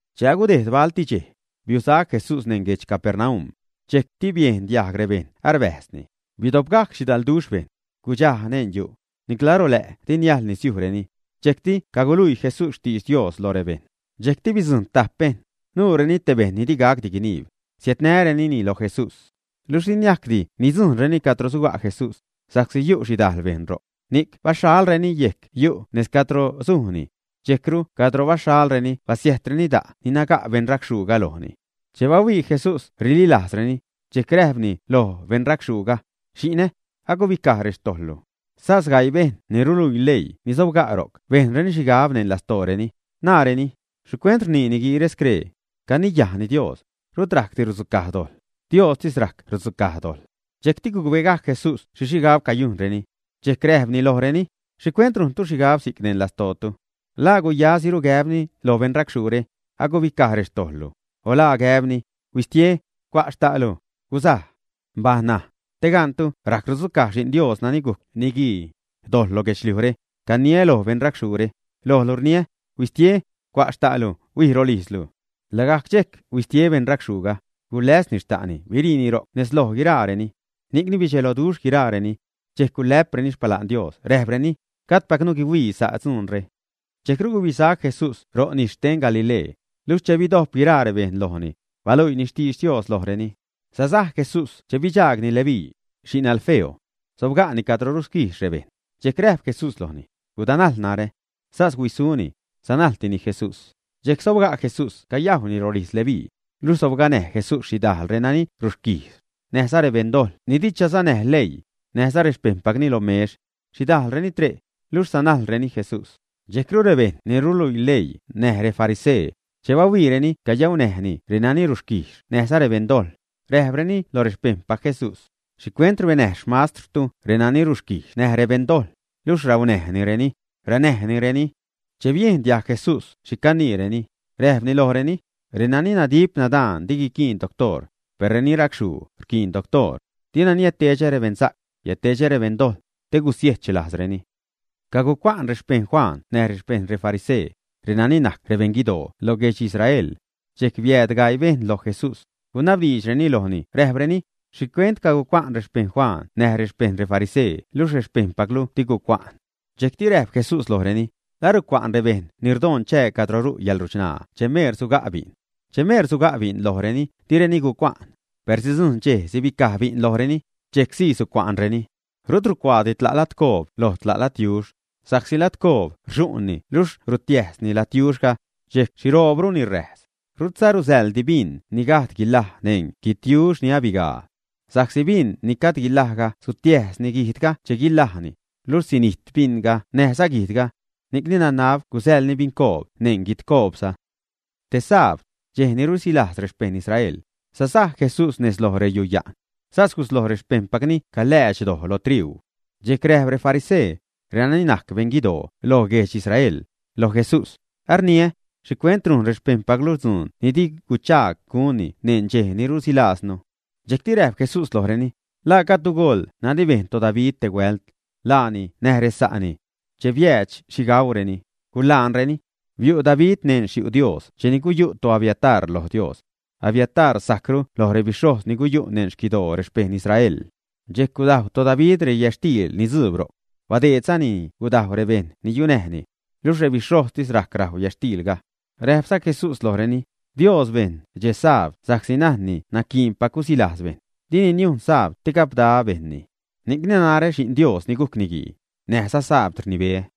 Che agudejd balti dxej, biusac Jesús neṉ guedx Capernaum. Dxejcti biejn diajg rebejṉ arbäjzni. Bidopgajc xhidalduxh bejṉ. Gudxaj neṉ yu'. Nicla rolä' di niajḻ nisiujreni. Dxejcti caguluii Jesús xtidx Dios lo rebejṉ. Dxejcti bidzujṉ tajp bejṉ, nuureni te bejṉ ni digacti guiniib; siädnärenini lo Jesús. Luxh di niajcdi nidzujṉreni cadro suga' Jesús, sa'csi yu' xhidajl bejṉ ro'c. Ni'c baxhalreni yejc yu' nejz cadro sujni. Dxejcru cadro baxhalreni basiäjtreni da' ni naga' beṉracxhuuga lojni. Che bahuii Jesús rililajzreni, dxejc räjpni loj beṉrachxhuuga: ―Xi'nä, agubicaj rextojḻlu. Sas gaii bejṉ ni ruluii leii ni sobga' ro'c bejnreni xhigab neṉ lastooreni, naareni: “¿Xhicuent rnii niguiire scree? Caniyajni Dios; rut rajcdi rudzucaj dojḻ. ¡Diostis rajc rudzucaj dojḻ!” Dxejcti gucbegajc Jesús xhi xhigab cayujnreni. Dxejc räjpni lojreni: ―¿Xhicuent rujntu xhigab si'c neṉ lastootu? ¿La guyasiru gäbni loj beṉracxhuure: “Agubicaj rextojḻlu”, o la gäbni: “Huistie, cua' xta'lu, gusaj”? Baj ṉaj, te gantu rajc rudzucaj Xi'n Dios, nani gujc Niguii, dojḻ lo guedxliujre, caniä loj beṉracxhuure: ―Lojlu rniä, ¡Huistie, cua' xta'lu, huij rolijzlu! Lagajc dxejc huistie beṉracxhuuga, guläzni xta'ni, biriini ro'c nez loj guiraareni. Ni'cni bidxelo guiraareni. Dxejc gulä'preni xpala'n Dios, räjpreni: ―Gajdpacnu guihuii sa' dzuunre. Dxejcru gubisac Jesús ro' nis xten Galilee, luxh che bidojp guiraa rebejṉ lojni, baluiini xtidx Dios lojreni. Sasaj Jesús che bidxaagni Leví, xi'n Alfeo. Sobga'ni cadro rusquijxni rebejṉ. Dxejc räjp Jesús lojni: ―Gudanajl narä. Sas huisuni, sanajltini Jesús. Dxejc sobga' Jesús cayajwni rolijz Leví. Luxh sobganäj Jesús xhidajl reni rusquijx, näjza rebeṉdojḻ ni di chasanäj leii, näjza rexpejṉpacni, lo mex. Xhidajlreni tre', luxh sanajlreni Jesús. Dxejcru rebejṉ ni ruluii leii näj refarisee, che bahuiireni cayaunäjni renani rusquijx näjza rebeṉdojḻ, räjpreni loj rexpejṉpac Jesús: ―¿Xhicuent rbenäj xmastrtu reni rusquijx näj rebeṉdojḻ, luxh raunäjnireni, ränäjnireni? Che biejn diajg Jesús xhi caniireni, räjpni lojreni: ―Renani nadip nadaan di guiquiin doctoor, per reni racxhuu rquiin doctoor. Dina niädtedxä rebeṉsa'c, biädtedxä rebeṉdojḻ, te gusiech lajzreni. Cagucua'n rexpejṉ Juan näj rexpejṉ refarisee, renani najc rebeṉguidoo loj guedx Israel. Dxejc biääd gaii bejṉ loj Jesús, gunabdiidxreni lojni räjpreni: ―¿Xhicuent cagucua'n rexpejṉ Juan näj rexpejṉ refarisee luxh rexpejṉpaclu di gucua'n? Dxejcti räjp Jesús lojreni: ―¿La rucua'n rebejṉ ni rdoṉ chää cadro ru' yäḻruchṉaa che meer suga' bi'n? Che meer suga' bi'n lojreni, direni gucua'n. Per sidzujṉ dxej sibicaj bi'n lojreni, dxejc sii sucua'nreni. ’Rut rucuaadi tla' ladcoob loj tla' ladyux, sa'csi ladcoob rxu'nni luxh rutiäjzni ladyuxga, dxejc xhiroobruni räjs. Rutza rusäḻdi bin ni gajd guilaj neṉ guidyux ni abigaa. Sa'csi bin ni gajd guilajga sutiäjsni guijdga che guilajni, luxh sinijt binga näjza guijdga. Ni'cni nanab gusäḻni bincoob neṉ guidcoobza. Te sabd, dxej ni rusilajz rexpejṉ Israel, sasaj Jesús nez loj reyuya'n. Sas gusloj rexpejṉpacni caläädx doj lo triuu. Dxejc räjp refarisee, renani najc beṉguidoo loj guedx Israel, loj Jesús: ―Arniä, ¿xhicuent rujn rexpejṉpaclu dzuun ni di guchaag gunni neṉ dxej ni rusilajznu, ä? Dxejcti räjp Jesús lojreni: ―¿La gajdtu goḻ nani bejn toDavid te huält, laani näj resa'ni, ä? Che biäädx xhi gauureni, gulaanreni. Biu' David neṉ xyu' Dios cheni guyu' toAbiatar loj Dios. Abiatar sajcru loj rebixhojz ni guyu' neṉ xquidoo rexpejṉ Israel. Dxejc gudajw toDavid reyätxtiil ni dzuub ro'c. Badeedzanini gudajw rebejṉ ni yunäjni. Luxh rebixhojztis rajc rajw yätxtiilga. Räjpza Jesús lojreni: ―Dios bejn dxe sabd sa'csi najnni naquiinpac gusilajz bejṉ. Dini niujn sabd te gapda bejṉni. Ni'cni narä, Xi'n Dios ni gujc Niguii, näjza sabd rnibeä.